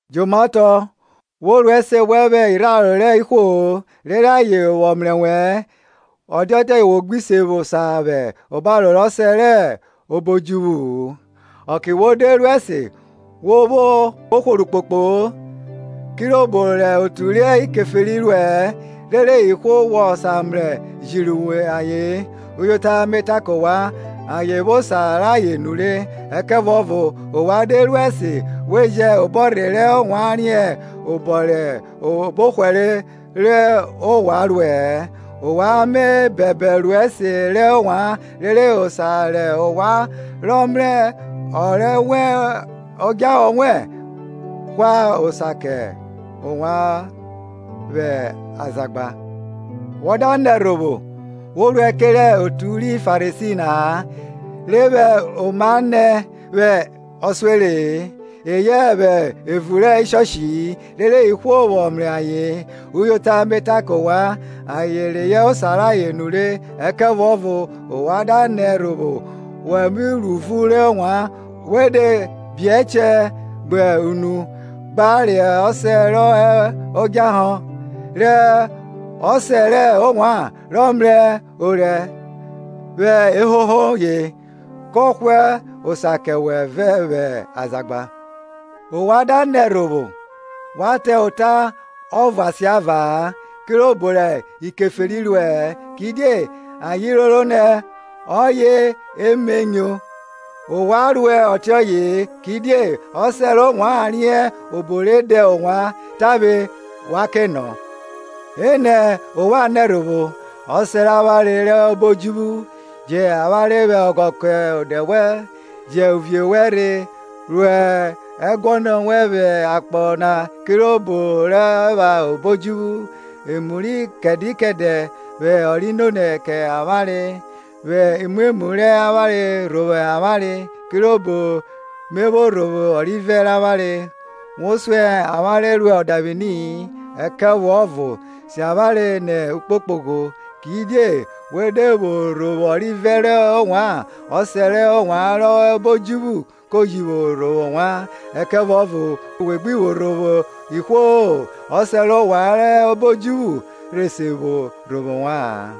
Jomaotọ, wo ru ẹse wẹn vwẹ irharo rẹ ihwo-o, rere ayen vwọ mrẹ wẹ-ẹ, ọ da dia ọtiọye wọ gbi se vwo osa vwẹ obaro rẹ ọsẹ rọ hẹ obo odjuvwu-u. Ọke wo de ru ẹse, wo vwo hworo ukpokpo-o, kirobo rẹ otu ri Keferi ruẹ-ẹ, rere ihwo vwọ mrasan jiri ayen. Uyota me ta kẹ ovwan, ayen vwo osa rayen nure. Ẹkẹvuọvo ovwan de ru ẹse we jẹ obọrhe rẹ ovwan riẹn obọ rẹ obọhwere rẹ ovwan ruẹ-ẹ. Ovwan me bẹbẹ ru ẹse rẹ ovwan; rere ọsẹ rẹ ovwan rọ mrẹ orẹ vwẹ odjahọ vwọ hwa osa kẹ ovwan vwẹ azagba. Wa da nẹ ẹrhovwo we ruẹ kerẹ otu ri Farisi na-a, re vwẹ oma nẹ vwẹ ọsuere-e, eyẹ vwẹ evun rẹ ishọshi-i, rere ihwo vwọ mrẹ ayen. Uyota me ta kẹ ovwan, ayen reyọ osa rayen nure. Ẹkẹvuọvo ovwan da nẹ ẹrhovwo, wa ro uvun rẹ ovwan, we de bi ẹchẹ gbe nu, gba rẹ ọsẹ rẹ ovwan rọ hẹ odjahọ, re ọsẹ rẹ ovwan rọ mrẹ orẹ vwẹ ehoho ye, kọ hwa osa kẹ wẹ vwẹ azagba. Ovwan da nẹ ẹrhovwo, wa ta ota ọvo asiava-a, kirobo rẹ ikeferi ruẹ-ẹ, kidie ayen roro nẹ ọye eme nyo. Ovwan ruẹ ọtiọye-e, Kidie ọsẹ rẹ ovwan riẹn obo re da ovwan tavwe wa ke nọ. Enẹ ovwan nẹ ẹrhovwo; Ọsẹ rẹ avwanre rọ hẹ obo odjuvwu, Jẹn avwanre vwẹ ọghọ kẹ ọde wẹn. Jẹn uvie wẹn rhe, ru ẹguọnọ wẹn vwẹ akpọ na kirobo re ruẹ vwẹ obo odjuvwu. Emu ri kẹdẹ kẹdẹ vwẹ ọ ri nonẹ kẹ avwanre. Vwẹ imwemwu rẹ avwanre rhovwo avwanre, Kirobo me vwo rhovwo ọrivẹ rẹ avwanre. Wo suẹn avwanre ro ọdavwini-i, ẹkẹvuọvo si avwanre nẹ ukpokpogho. Kidie we de vwo rhovwo ọrivẹ rẹ ovwan, Ọsẹ rẹ ovwan rọ hẹ obo odjuvwu ko ji vwo rhovwo ovwan. Ẹkẹvuọvo we gbi vwo rhovwo ihwo-o, Ọsẹ rẹ ovwan rọ hẹ obo odjuvwu rhe se vwo rhovwo ovwa-an.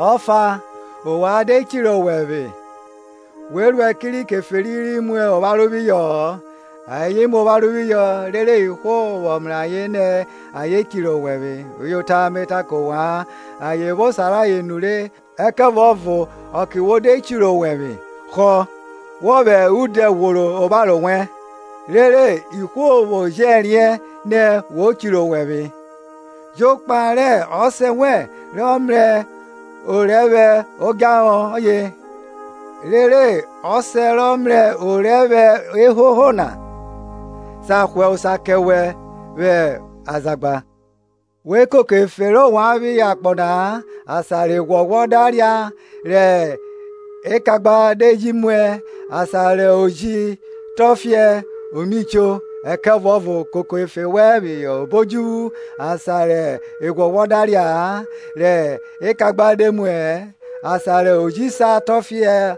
Ọfa, ovwan de chirẹ owẹvwe, we ruẹ kerẹ ikeferi ri mu opharo phihọ-ọ; ayen mu opharo phihọ rere ihwo vwọ mrẹ ayen nẹ ayen chirẹ owẹvwe. Uyota me ta kẹ ovwan, ayen vwo osa rayen nure. Ẹkẹvuọvo ọke wo de chirẹ owẹvwe, họ, wọ vwẹ udẹ ghworo opharo wẹn; Rere ihwo vwo jẹ riẹn nẹ wo chirẹ owẹvwe, jokpa rẹ ọsẹ wẹn rọ mrẹ orẹ vwẹ odjahọ; rere Ọsẹ wẹn rọ mrẹ orẹ vwẹ odjahọ na, sa hwa osa kẹ wẹ vwẹ azagba. We koko efe rẹ ovwan phihọ akpọ na-a; asan rẹ ẹghwọghwọ da ria rẹ ekagba de ji muẹ, asan rẹ oji tọfiẹ o mi cho. Ẹkẹvuọvo koko efe wẹn phihọ obo odjuvwu, asan rẹ eghwọghwọ da ria-a, rẹ ekagba de muẹ-ẹ, asan rẹ oji sa tọfiẹ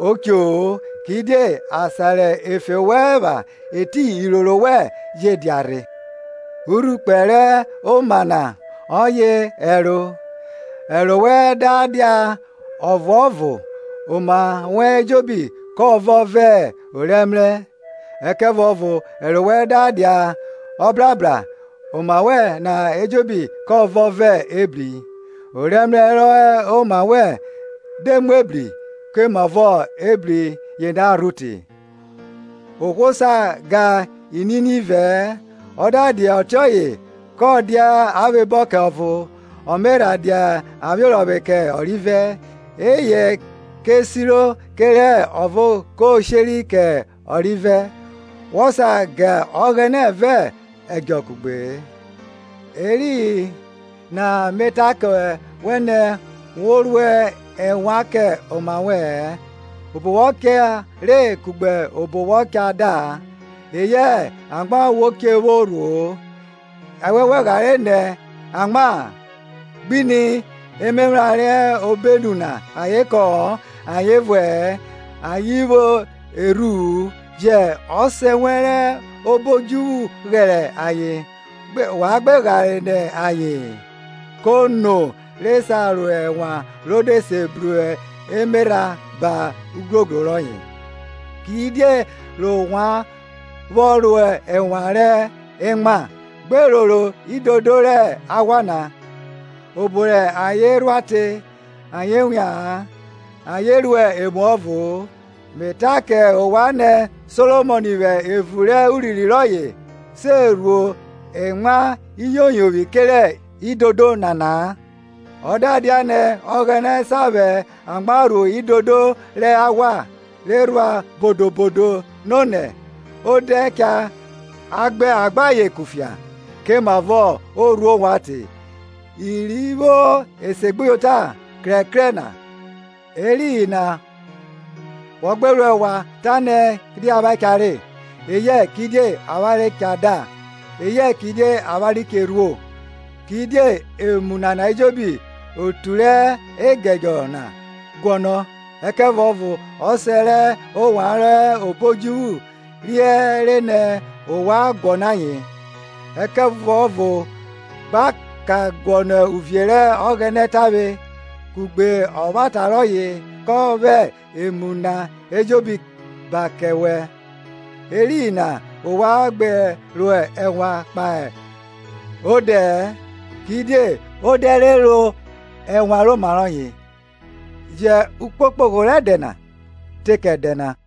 o cho-o. Kidie asan rẹ efe wẹn epha etiyin iroro wẹn je dia rhe. Urhukpe rẹ oma na ọye ẹro; ẹro wẹn da dia ọkpokpọ, oma wẹn ejobi ko vọn vẹ orẹmrẹ. Ẹkẹvuọvo ẹro wẹn da dia brabra, oma wẹn na ejobi kọ vọn vẹ ebri. Ọrẹmrẹ rọ hẹ oma wẹn de mu ebri, komavọ ebri yena rho te! Ohwo sa ga inini ivẹ-ẹ, ọ da dia ọtiọye kọ dia avwebọ kẹ ọvo, ọ me rha dia avwiorọvwe kẹ ọrivẹ; eyẹ ko si kẹre ọvo ko sheri kẹ ọrivẹ; Wọ sa ga Ọghẹnẹ vẹ ẹdjọ kugbe-e. Eriyin na me ta kẹ wẹ nẹ, wọ rua ẹnwan kẹ oma wẹ-ẹn, obo wọ cha re kugbe obọ wọ cha da-a, eyẹ amwa wo che vwo rhuo-o. Ẹnwẹn wẹ ghare nọ amwa-a? Gbe ni emephran re hẹ obenu na, ayen kọ-ọn, ayen vuẹ-ẹ, ayen vwo erhu-u, jẹ Ọsẹ wẹn rọ hẹ obo odjuvwu ghẹrẹ ayen. Ovwan gbe ghare nọ aye-en? Kono re sa ro ẹnwan ro de se bru emerha ba ugrogro rọye? Kidie ovwan vwọ ro ẹnwan rẹ emwa? Gbe roro idodo rẹ aghwa na, obo rẹ ayen rhua te; ayen wia-an, ayen ruẹ emuọvo-o. Me ta kẹ ovwan nẹ, Solomọn vwẹ evun rẹ urinrin rọye, se rhuo emwa iyoyovwi kerẹ idodo nana-a. Ọ da dia nẹ Ọghẹnẹ sa vwẹ amwa rhuo idodo rẹ aghwa, re rhua bodo bodo nonẹ, odẹ rọ cha a gbẹn ayen kufia, komavọ o rhuo ovwan te, iri vwo esegbuyota krẹkrẹ na? Eriyin na wọ gbe ro ẹnwan ta nẹ, kidie avwanre cha re? eyẹ kidie avwanre cha da? eyẹ kidie avwanre che vwo rhuo? Kidie emu nana ejobi otu rẹ egedjọ na guọnọ ayen. Ẹkẹvuọvo Ọsẹ rẹ ovwan rọ hẹ obo odjuvwu riẹre nẹ ovwan guọnọ ayen. Ẹkẹvuọvo gba ka guọnọ uvie rẹ Ọghẹnẹ tavwe, kugbe ọvwata rọye, kọ vwẹ emu na ejobo ba kẹ wẹ. Eriyin na ovwan gbe ro ẹnwan kpahe odẹ-ẹ, kidie odẹ cha ro ẹnwan rẹ oma roye. Jẹn ukpokpogho rẹ ẹdẹ na te kẹ ẹdẹ na.